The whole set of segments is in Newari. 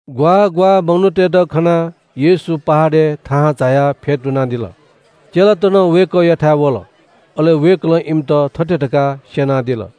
ग्‍वाः ग्‍वाः मनूतय्‌त खनाः येशू पहाडय् थाहां झायाः फ्‍यतुनादिल। चेलात नं वय्‌कःयाथाय् वल। अले वय्‌कलं इमित थथे धकाः स्‍यनादिल –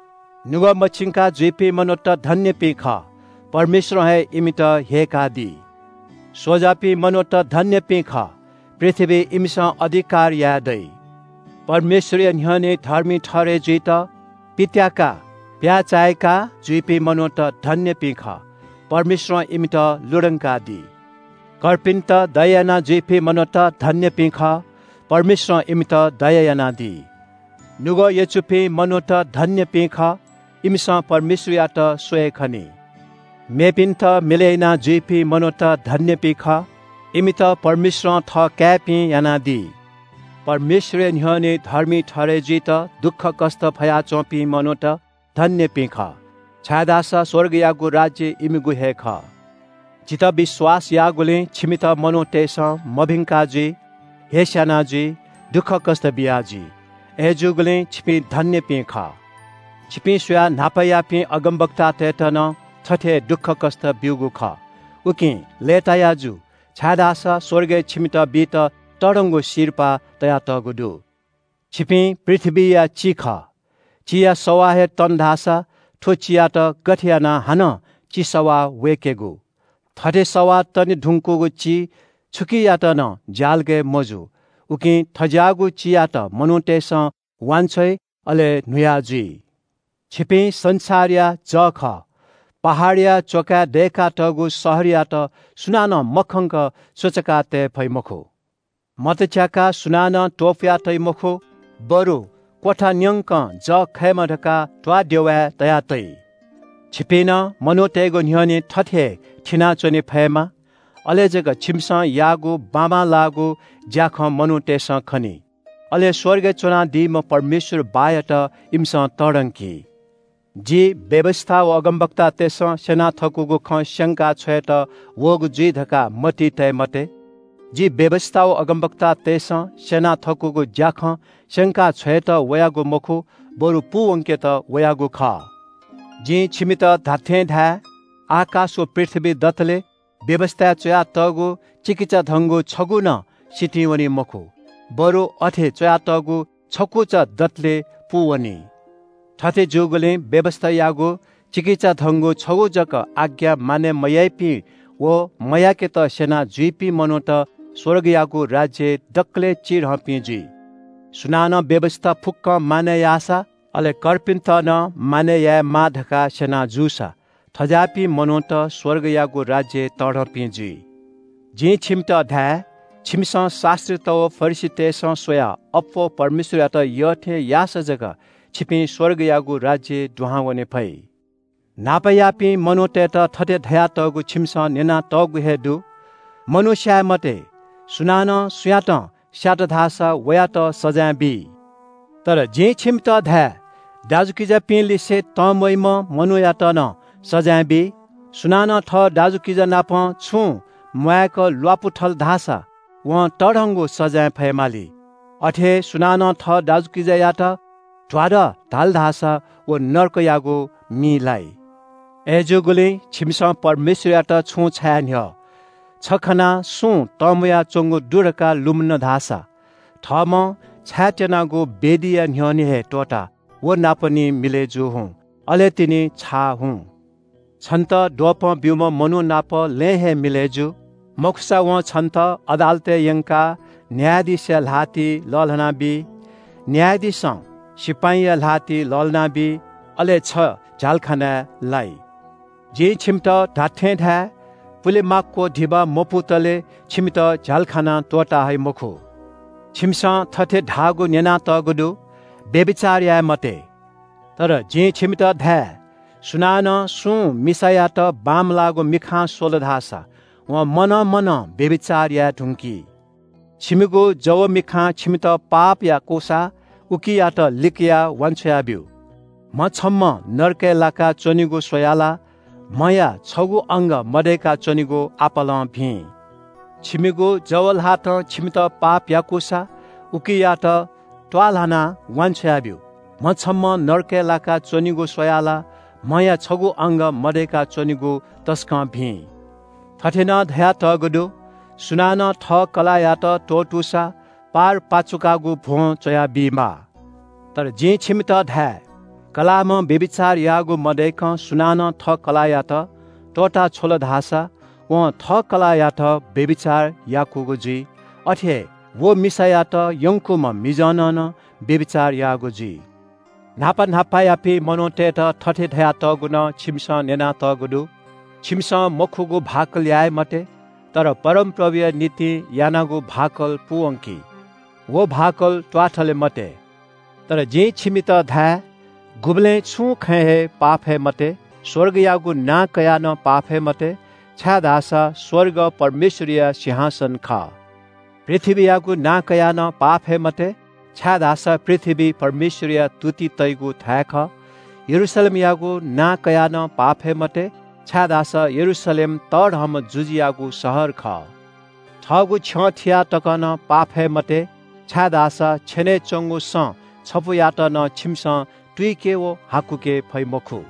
नुगः मछिंका जुइपिं मनूत धन्‍यपिं खः, परमेश्‍वरं हे इमित ह्यय्‌कादी। स्‍वजापिं मनूत धन्‍यपिं खः, पृथ्‍वीइ इमिसं अधिकार यायेदइ। परमेश्‍वरया न्‍ह्यःने धर्मी ठहरय् जुइत पित्‍याकाः प्‍याय्‌चाय्‌का जुइपिं मनूत धन्‍यपिं खः, परमेश्‍वरं इमित लुधंकादी। कर्पिन्‍त दया यानाजुइपिं मनूत धन्‍यपिं खः, परमेश्‍वरं इमित दया यानादी। नुगः यचुपिं मनूत धन्‍यपिं खः, इमिसं परमेश्‍वरयात स्‍वये खनी। मेपिन्‍त मिलय् यानाजुइपिं मनूत धन्‍यपिं खः, इमित परमेश्‍वरं थःकाय्‌पिं यानादी। परमेश्‍वरया न्‍ह्यःने धर्मी ठहरय् जुइत दुःखकष्‍ट फयाच्‍वंपिं मनूत धन्‍यपिं खः, छाय्‌धाःसा स्‍वर्गयागु राज्‍य इमिगु हे खः।” “जितः विश्‍वास याःगुलिं छिमित मनूतय्‌सं मभिंका जुइ, हेस्‍याना जुइ, दुःखकष्‍ट बियाजुइ। अय्‌जूगुलिं छिपिं धन्‍यपिं खः। छिपिं स्‍वयाः न्‍हापायापिं अगमवक्तातय्‌त नं थथे हे दुःखकष्‍ट ब्‍यूगु खः। उकिं लय्‌ताया जु, छाय्‌धाःसा स्‍वर्गय् छिमित बीत तःधंगु सिरपाः तयातःगु दु। “छिपिं पृथ्‍वीया चि खः। चिया सवाः हे तन धाःसा थ्‍व चियात गथे यानाः हानं चि सवाः वय्‌केगु? थथे सवाः तने धुंकूगु चि छुकियात नं ज्‍यालगय् मजू, उकिं थज्‍याःगु चियात मनूतय्‌सं वांछ्वइ, अले न्‍हुया जुइ। “छिपिं संसारया जः खः। पहाडया च्‍वकाय् दय्‌कातःगु शहरयात सुनानं मखंक सुचुकातये फइ मखु। मत च्‍याकाः सुनानं त्‍वपुयातइ मखु, बरु क्‍वथा न्‍यंक जः खयेमा धकाः त्‍वाःदेवाय् तयातइ। छिपिं नं मनूतय्‌गु न्‍ह्यःने थथे हे थिनाच्‍वने फयेमाः। अले जक छिमिसं याःगु बाबांलाःगु ज्‍याखँ मनूतय्‌सं खनी, अले स्‍वर्गय् च्‍वनादीम्‍ह परमेश्‍वर बाःयात इमिसं तःधंकी। “जि व्‍यवस्‍था व अगमवक्तातय्‌सं स्‍यना थकूगु खँ स्‍यंका छ्वयेत वःगु जुइ धकाः मतिइ तये मते। जि व्‍यवस्‍था व अगमवक्तातय्‌सं स्‍यना थकूगु ज्‍याखँ स्‍यंका छ्वयेत वयागु मखु, बरु पूवंकेत वयागु खः। जिं छिमित धात्‍थें धाये – आकाश व पृथ्‍वी दतले व्‍यवस्‍थाय् च्‍वयातःगु चिकिचाधंगु छगू नं सितिं वनी मखु, बरु अथे च्‍वयातःगु छकुचा दतले पूवनी। थथे जूगुलिं व्‍यवस्‍थायागु चिकिचाधंगु छगू जक आज्ञा मानय् मयाइपिं व मयाकेत स्‍यना जुइपिं मनूत स्‍वर्गयागु राज्‍यय् दकलय् चिधंपिं जुइ। सुनानं व्‍यवस्‍था फुक्‍कं मानय् याःसा, अले कर्पिन्‍त नं मानय् यायेमाः धकाः स्‍यना जूसां थज्‍याःपिं मनूत स्‍वर्गयागु राज्‍यय् तःधंपिं जुइ। “जिं छिमित धाये – छिमिसं शास्‍त्रीत व फरिसीतय्‌सं स्‍वयाः अप्‍वः परमेश्‍वरयात यःथें याःसा जक छिपिं स्‍वर्गयागु राज्‍यय् दुहां वने फइ। “न्‍हापायापिं मनूतय्‌त थथे धयातःगु छिमिसं न्‍यनातःगु हे दु – ‘मनू स्‍याये मते, सुनानं सुयातं स्‍यात धाःसा वयात सजाँय बी।’ तर जिं छिमित धाये – दाजुकिजापिंलिसे तंम्‍वइम्‍ह मनूयात नं सजाँय बी। सुनानं थः दाजुकिजानापं छुं म्‍वाय्‌क ल्‍वापु थल धाःसा वं तःधंगु सजाँय फयेमाली। अथे हे सुनानं थः दाजुकिजायात ‘ध्‍वादः’ धाल धाःसा व नरकयागु मिइ लाइ। “अय्‌जूगुलिं छिमिसं परमेश्‍वरयात छुं छाये न्‍ह्यः छ खनाः छिमि किजा तंम्‍वया च्‍वंगु दु धकाः लुमन धाःसा थःम्‍हं छायेत्‍यनागु वेदीया न्‍ह्यःने हे त्‍वःताः किजानापं निं मिलय् जू हुँ, अले तिनि छाः हुँ। “छन्‍त द्वपं ब्‍यूम्‍ह मनू नाप लँय् हे मिलय् जु। मखुसा वं छन्‍त अदालतय् यंकाः न्‍यायाधीशया ल्‍हातिइ लःल्‍हानाबी। न्‍यायाधीशं सिपाइँया ल्‍हातिइ लःल्‍हानाबी। अले छ झ्‍यालखानाय् लाइ। जिं छिमित धात्‍थें धाये – पुले माक्‍व धिबा मपुतले छिमित झ्‍यालखानां त्‍वःता हइ मखु। “छिमिसं थथे धाःगु न्‍यनातःगु दु – ‘व्‍यभिचार याये मते।’ तर जिं छिमित धाये – सुनानं सुं मिसायात बांमलाःगु मिखां स्‍वल धाःसा वं मनं मनं व्‍यभिचार याये धुंकी। छंगु जव मिखां छन्‍त पाप याकूसा उकियात लिकयाः वान्‍छ्वया ब्‍यु। म्‍ह छम्‍हं नरकय् लाकाः च्‍वनेगु स्‍वयाः ला म्‍हया छगू अंग मदय्‌का च्‍वनेगु आपालं भिं। छंगु जव ल्‍हातं छन्‍त पाप याकूसा उकियात त्‍वाःल्‍हानाः वान्‍छ्वया ब्‍यु। म्‍ह छम्‍हं नरकय् लाका च्‍वनेगु स्‍वयाः ला म्‍हया छगू अंग मदय्‌का च्‍वनेगु तसकं भिं। “थथे नं धयातःगु दु – ‘सुनानं थः कलाःयात त्‍वःतूसा पारपाचुकागु भ्‍वं च्‍वयाः बीमाः।’ तर जिं छिमित धाये – कलाःम्‍हं व्‍यभिचार याःगु मदय्‌कं सुनानं थः कलाःयात त्‍वःता छ्वल धाःसा वं थः कलाःयात व्‍यभिचार याकूगु जुइ। अथे हे व मिसायात यंकूम्‍ह मिजंनं नं व्‍यभिचार याःगु जुइ। “न्‍हापा न्‍हापायापिं मनूतय्‌त थथे धयातःगु नं छिमिसं न्‍यनातःगु दु – ‘छिमिसं मखुगु भाकल याये मते, तर परमप्रभुया निंतिं यानागु भाकल पूवंकि। व भाकल त्‍वाःथले मते।’ तर जिं छिमित धाये – गुबलें छुं खँय् हे पाफये मते। स्‍वर्गयागु नां कयाः नं पाफये मते, छाय्‌धाःसा स्‍वर्ग परमेश्‍वरया सिंहासन खः। पृथ्‍वीयागु नां कयाः नं पाफये मते, छाय्‌धाःसा पृथ्‍वी परमेश्‍वरया तुति तइगु थाय् खः। यरूशलेमयागु नां कयाः नं पाफये मते, छाय्‌धाःसा यरूशलेम तःधंम्‍ह जुजुयागु शहर खः। थःगु छ्यं थियाः तक नं पाफये मते, छाय्‌धाःसा छेनय् च्‍वंगु सँ छपुयात नं छिमिसं तुइके व हाकुके फइ मखु।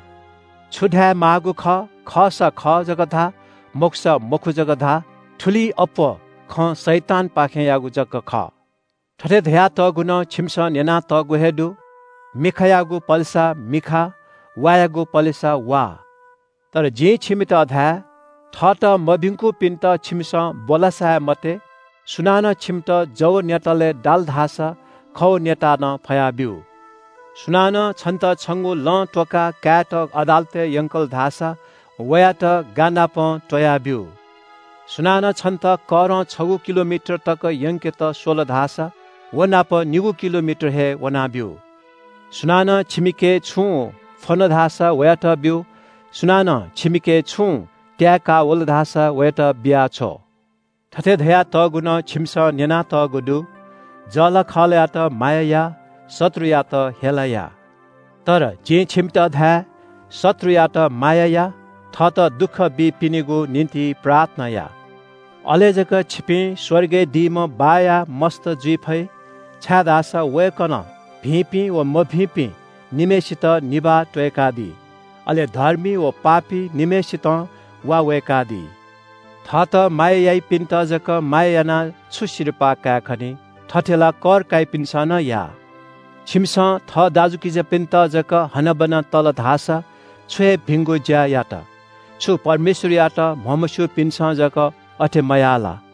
छु धायेमाःगु खः – खःसा खः जक धा, मखुसा मखु जक धा। थुलिं अप्‍वः खँ शैतानपाखेंयागु जक खः। “थथे धयातःगु नं छिमिसं न्‍यनातःगु हे दु – ‘मिखायागु पलेसा मिखा, वायागु पलेसा वा।’ तर जिं छिमित धाये – थःत मभिंकूपिन्‍त छिमिसं ब्‍वलासाये मते। सुनानं छिमित जव न्‍यतालय् दाल धाःसा खव न्‍यताः नं फया ब्‍यु। सुनानं छन्‍त छंगु लं त्‍वकाः कायेत अदालतय् यंकल धाःसा वयात गानापं त्‍वया ब्‍यु। सुनानं छन्‍त करं छगू किलोमिटर तक यंकेत स्‍वल धाःसा व नाप निगू किलोमिटर हे वना ब्‍यु। सुनानं छंके छुं फ्‍वन धाःसा वयात ब्‍यु। सुनानं छंके छुं त्‍याये का वल धाःसा वयात बिया छ्व। “थथे धयातःगु नं छिमिसं न्‍यनातःगु दु – ‘जःलाखःलायात माया या, शत्रुयात हेला या।’ तर जिं छिमित धाये – शत्रुयात माया या, थःत दुःख बीपिनिगु निंतिं प्रार्थना या। अले जक छिपिं स्‍वर्गय् दीम्‍ह बाःया मस्‍त जुइ फइ, छाय्‌धाःसा वय्‌कलं भिंपिं व मभिंपिं निम्‍हय्‌सितं निभाः त्‍वय्‌कादी। अले धर्मी व पापी निम्‍हय्‌सितं वा वय्‌कादी। थःत माया याइपिन्‍त जक माया यानाः छु सिरपाः कायेखनी? थथे ला कर काइपिन्‍सं नं याः। छिमिसं थः दाजुकिजापिन्‍त जक हनाबना तल धाःसा छु हे भिंगु ज्‍या यात? छु परमेश्‍वरयात म्‍हमस्‍यूपिन्‍सं जक अथे मयाः ला?